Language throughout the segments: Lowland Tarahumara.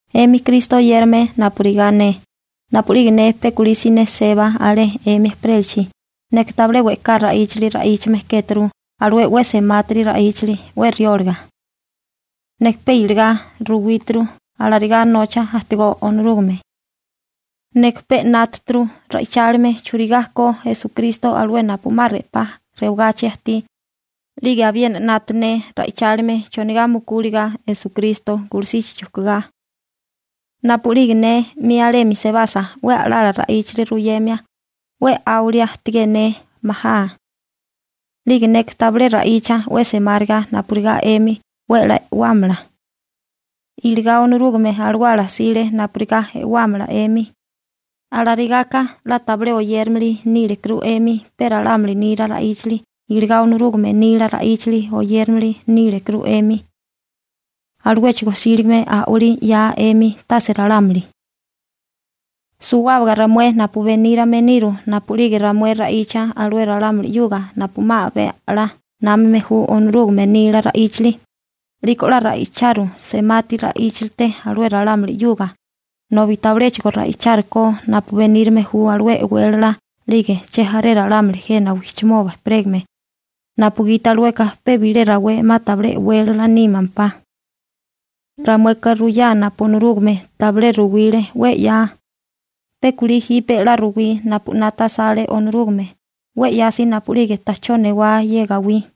'Emi Kristo oyérame napurigá ne, napu'lige ne pe kulí siné seba alé 'emi ejperélachi, neka tabilé we'ká ra'íchali ra'íchame kéturu alué 'we semátiri ra'íchali 'we rióliga. Neka pe iligá ruwíturu alarigá nocha ajtigó Onorúgame. Neka pe 'nátaturu ra'ichálime churigá ko Esukristo alué napu 'ma 'pa rewagachi ajtí, 'lige abiena 'nata ne ra'ichálime chonigá mukúliga Esukristo gulusichi chujkugá. Napu'lige ne 'mi alemi sebasa 'we a'lala ra'íchali ruyemia, 'we 'áwilia ajtigé ne majá. 'Lige neka tabilé ra'icha 'we semáriga napurigá 'emi 'we 'la e'wámala. Iligá Onorúgame Alawala 'sile napurigá e'wámala 'emi. Alarigaka 'la tabilé oyérimili nílekuru 'emi pe ralámuli nila ra'íchali iligá Onorúgame nila ra'íchali oyérimili nílekuru 'emi, aluéchigo 'síligame a'walí 'yaa 'emi, tase ralámuli. Suwábaga ramué napu benírame niru, napu'lige ramué ra'icha alué ralámuli 'yuga napu 'ma abé a'lá námame ju Onorúgame nila ra'íchali, 'liko 'la ra'icharu semati ra'íchalite alué ralámuli 'yuga, nobi tabiléchigo ra'ichárikó napu benírame ju alué e'wélala 'lige chejaré ralámuli jena wijchimoba ejperégame, napugiti alueka pe bilé rawé 'ma tabilé e'wélala nímempá. Ramueka ruyá napu Onorúgame tabilé ruwile 'we 'ya, pe kulí jipe 'la ruwí napu 'nata asale Onorúgame 'we 'yasi napu'lige ta'chó newá ye gawí.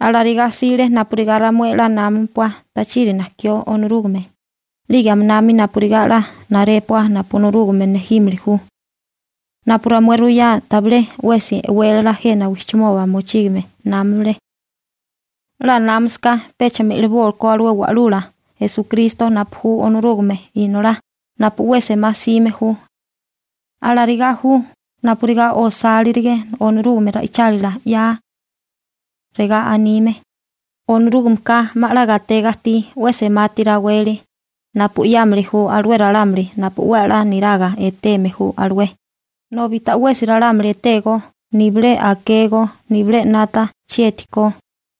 Alarigá 'sile napurigá ramué 'la námapua tachiri najkió Onorúgame, 'lige aminami napurigá 'la narépua napu Onorúgame nejímili ju. Napu ramué ruyá tabilé 'wesi e'wélala jena wijchimoba mochígame námale. 'La námasaká pecha me'libókó alué Wa'lula Esukristo napu ju Onorúgame Inolá napu 'we semá 'sime ju. Alarigá ju napurigá osálirige Onorúgame ra'ichálila 'ya. Regá anime: Onorúgameka 'ma 'la gatega ajtí 'we semati raweli napu 'yámili ju alué ralámuli napu 'we 'la niraga eteme ju alué nobi ta'wesi ralámuli etégó nibilé akégó nibilé 'nata chieti ko.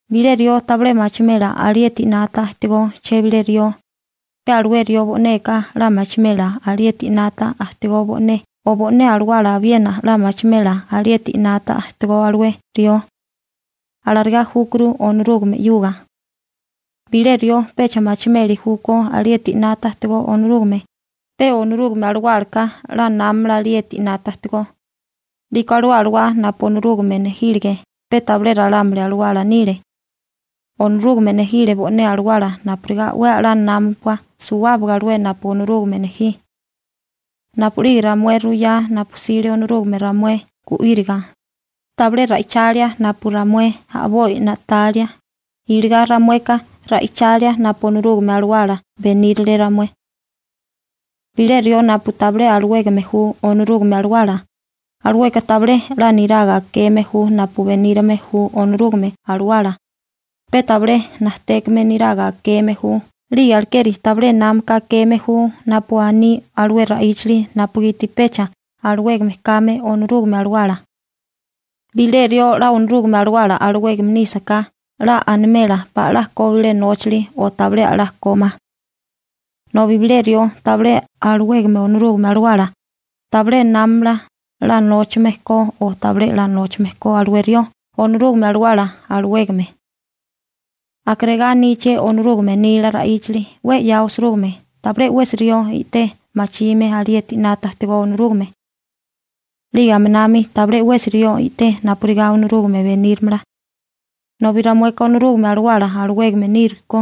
Bilé rió tabilé machimela alieti 'nata ajtigó chebilé rió, pe alué rió bo'neka 'la machimela alieti 'nata ajtigó bo'né o bo'né alawala abiena 'la machimela alieti 'nata ajtigó alué rió. Alarigá júkuru Onorúgame 'yuga. Bilé rió pecha machimeli júkó alieti 'nata ajtigó Onorúgame, pe Onorúgame Alawálaka 'la námamala alieti 'nata ajtigó. 'Liko alué Alawá napu Onorúgame nejílige pe tabilé ralámuli alawala nile. Onorúgame nejile bo'né Alawala napurigá 'we a'lá námapua suwábaga alué napu Onorúgame nejí. Napu'lige ramué ruyá napu 'sile Onorúgame ramué gu'íriga, tabilé ra'ichalia napu ramué a'boi na'talia, iligá ramueka ra'ichalia napu Onorúgame Alawala benírale ramué. Bilé rió napu tabilé alawégame ju Onorúgame Alawala, alueka tabilé 'la niraga akeme ju napu benírame ju Onorúgame Alawala, pe tabilé najtékame niraga akeme ju 'lige alekeri tabilé námaka akeme ju napu aní alué ra'íchali napugiti pecha alawégame kame Onorúgame Alawala. Bilé rió 'la Onorúgame Alawala alawégame nísaká 'la animela pala 'la ko bilé nóchali o tabilé 'la ko ma. Nobi bilé rió tabilé alawégame Onorúgame Alawala, tabilé námamala 'la nóchame ko o tabilé 'la nóchame ko alué rió Onorúgame Alawala alawégame. Aka regá aníché Onorúgame nila ra'íchali 'we 'ya osirúgime: «Tabilé 'wesi rió i'té machime alieti 'nata ajtigó Onorúgame. 'Lige aminami tabilé 'wesi rió i'té napurigá Onorúgame benírimala.» Nobi ramueka Onorúgame Alawala alawégame nírukó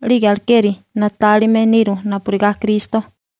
'lige alekeri na'tálime niru napurigá Kristo.